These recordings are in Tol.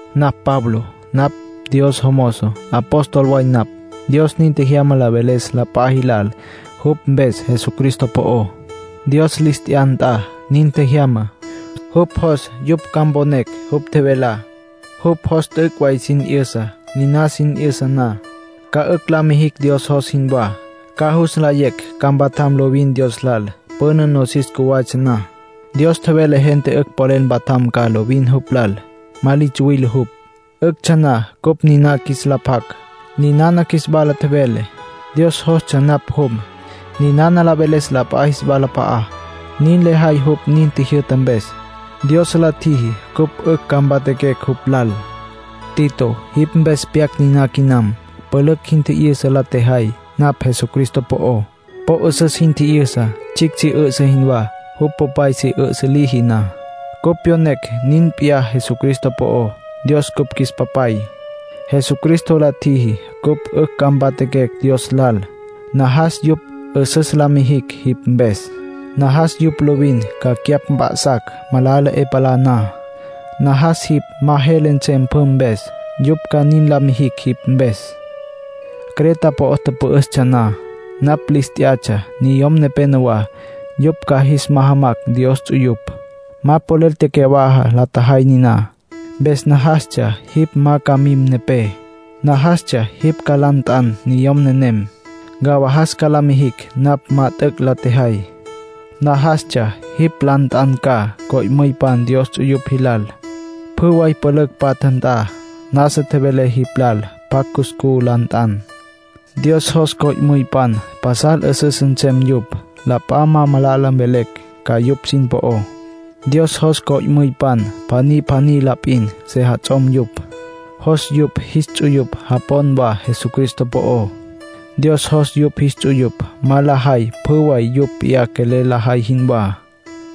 Napj Pablo. Napj Dios jomozo. Apóstol way napj; Dios nin tjejyama la veles la p'a jilal jupj mpes Jesucristo po'ó. Dios lis t'ya nt'a nin tjejyama; jupj jos yupj ca mponecj jupj tjevelá. Jupj jos t'üc' way sin 'yüsa. Niná sin 'yüsa na, ca 'ücj la mijicj Dios jos jinwá. Ca jus nlayecj ca mpatjam lovin Dios lal. Püna, nosis cjuwatsja na, Dios tjevele gente 'ücj polel mpatjam ca lovin jupj lal. Ma li tsuwile jupj. 'Üctsja na cupj niná qjuis la pjac, ninana qjuis wala tjevele. Dios jostsja napj jum, ninana la veles la p'a jis walap'a'á. Nin lejay jupj nin tjijyü'ta mpes. Dios la tjiji cupj 'ücj ca mpatjaquecj jupj lal. Tito, jipj mpes pyac niná quinam. Pülücj jin tji'yüsa la tjejay napj Jesucristo po'ó. Po 'üsüs jin tji'yüsa, tsjicj si 'üsǘ jinwá, jupj popay si 'üsǘ liji na. Cupj pyonecj nin p'iyá Jesucristo po'ó. Dios cupj qjuis Papay. Jesucristo la tjiji cupj 'ücj ca mpatjaquecj Dios lal. Najas yupj 'üsüs ca la mijicj jipj mpes. Najas yupj lovin ca cyapj mp'a'sacj, malala 'e palá na. Najas jipj ma jele nsem pjü mpes, yupj ca nin la mijicj jipj mpes. Creta po'o tüpü'üstsja na, napj lis t'yatsja niyom nepenowá, yupj ca jis majamacj Dios ts'uyupj. Ma polel tecyawaja la tjejay niná. Mpes najastsja jipj ma ca mim nepé; najastsja jipj ca la nt'an niyom nenem, ncawajas ca la mijin napj ma t'üc' la tjejay. Najastsja jipj la nt'an ca co'müypan Dios ts'uyupj jilal, pjü way pülücj patja nt'a. Nasa tjevelé jipj lal pjacj cuscú la nt'an. Dios jos co'müypan pasal 'üsüs nsem yupj, la p'a ma malala mvelecj ca yupj sin po'ó. Dios jos co'müypan pjaní pjaní la p'in sejats'om yupj. Jos yupj jis ts'uyupj japon wa Jesucristo po'ó. Dios jos yupj jis ts'uyupj ma lajay pjü way yupj p'iyá quelel lajay jinwá.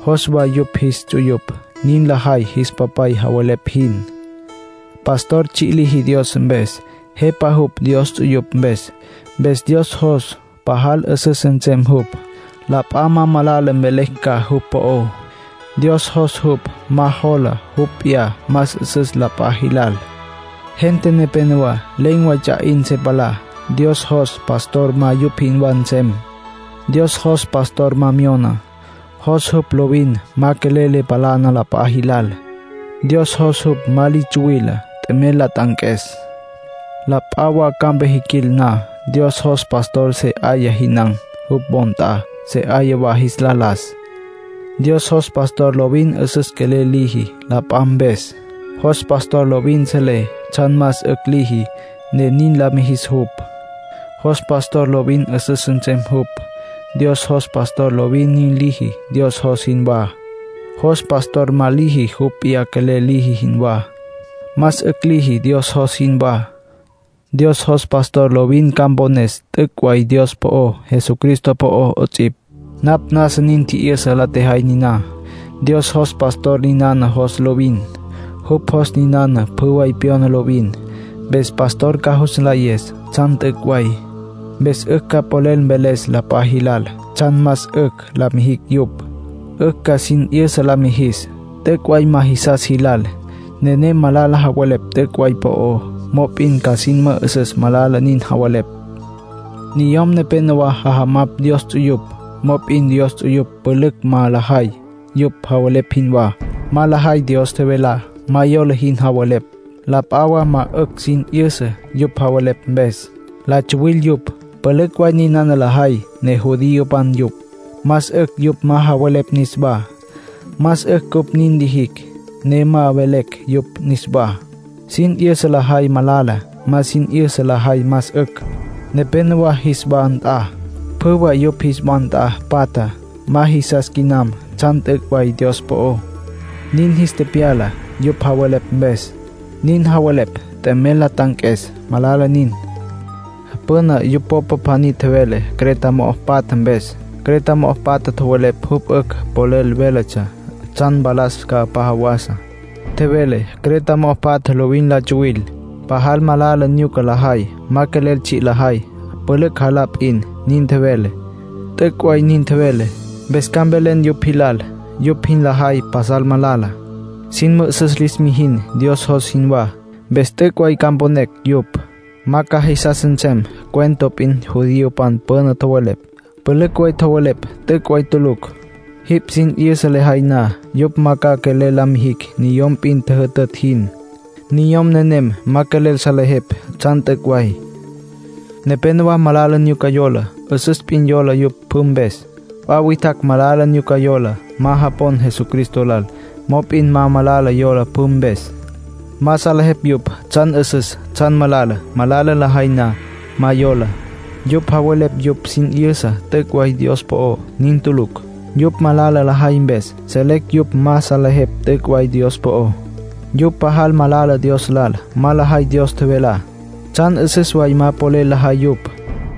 Jos wa yupj jis ts'uyupj nin lajay jis papay javelepj jin. Pastor tsji' liji Dios mpes. Jepa jupj Dios ts'uyupj mpes. Mpes Dios jos pajal 'üsüs nsem jupj, la p'a ma malala mvelecj ca jupj po'ó. Dios jos jupj ma jola jupj p'iyá más 'üsüs la p'a jilal. Gente nepénowa len̈ way ts'a 'in se palá. Dios jos pastor ma yupj jinwá nsem. Dios jos pastor ma myona. Jos jupj lovin ma quelel le palana la p'a jilal. Dios jos jupj ma li tsuwile t'emel la t'anques. La p'a wa campa jiquil na, Dios jos pastor se 'aya jinan̈ jupj wo nt'a, se 'aya wa jis la las. Dios jos pastor lovin 'üsüs quelel liji la p'a mpes. Jos pastor lovin selé tsjan más 'ücj liji, ne nin la mijis jupj. Jos pastor lovin 'üsüs nsem jupj. Dios jos pastor lovin nin liji Dios jos jinwá. Jos pastor ma liji jupj p'iyá quelel liji jinwá. Más 'ücj liji Dios jos jinwá. Dios jos pastor lovin ca mpones t'üc' way Dios po'ó, Jesucristo po'ó 'ots'ipj. Napj nasa sin tji'yüsa la tjejay niná. Dios jos pastor ninana jos lovin. Jupj jos ninana pjü way pyona lovin. Mpes pastor ca jus nlayes tsjan t'üc' way. Mpes 'ücj ca polel mveles la p'a jilal tsjan más 'ücj la mijicj yupj. 'Ücj ca sin 'yüsa la mijis, t'üc' way ma jisas jilal. Nenem malala javelepj t'üc' way po'ó, mop'in ca sin mü'üsüs malala nin javelepj. Niyom nepénowa jajamapj Dios ts'uyupj, mop'in Dios ts'uyupj pülücj ma lajay yupj javelepj jinwá. Ma lajay Dios tjevelá. Ma yola jin javelepj; la p'a wa ma 'ücj sin 'yüsa yupj javelepj mpes. La tsuwil yupj. Pülücj way ninana lajay ne judiopan yupj. Más 'ücj yupj ma javelepj niswá; más 'ücj cupj nin lijicj ne ma mvelecj yupj niswá. Sin 'yüsa lajay malala. Ma sin 'yüsa lajay más 'ücj. Nepénowa jis wa nt'a, pjü way yupj jis wa nt'a patja ma jisas quinam tsjan t'üc' way Dios po'ó; nin jis tepyala yupj javelepj mpes. Nin javelepj t'emel la t'anques. Malala nin. Püna yupj popa pjaní tjevele Creta mo'o patja mpes. Creta mo'o patja tjowelepj jupj 'ücj polel véletsja tsjan mpalas ca p'a jawasa. Tjevele: “Creta mo'o patja lovin la tsuwil. Pajal malala nyuca lajay. Ma quelel tsji' lajay; pülücj jalá la p'in”, nin tjevele. T'üc' way nin tjevele. Mpes ca mvelen yupj jilal yupj jin lajay pasal malala. Sin mü'üsüs lis mijin Dios jos jinwá. Mpes t'üc' way ca mponecj yupj. Ma ca jisas nsem cuento p'in judiopan püna tjowelepj. Pülücj way tjowelepj t'üc' way tulucj. Jipj sin 'yüsa lejay na, yupj ma ca quelel la mijicj niyom p'in tjüjütütj jin. Niyom nenem ma quelel salejepj tsjan t'üc' way. Nepénowa ma malala nyuca yola. 'Üsüs p'in yola yupj pjü mpes. P'a witjacj malala nyuca yola. Ma japon Jesucristo lal. Mop'in malala yola pjü mpes. Ma salejepj yupj tsjan 'üsüs, tsjan malala. Malala lajay na, ma yola. Yupj javelepj yupj sin 'yüsa t'üc' way Dios po'ó. Nin tulucj. Yupj malala lajay mpes, selecj yupj ma salejepj t'üc' way Dios po'ó. Yupj pajal malala Dios lal. Ma lajay Dios tjevelá. Tsjan 'üsüs way ma polel lajay yupj.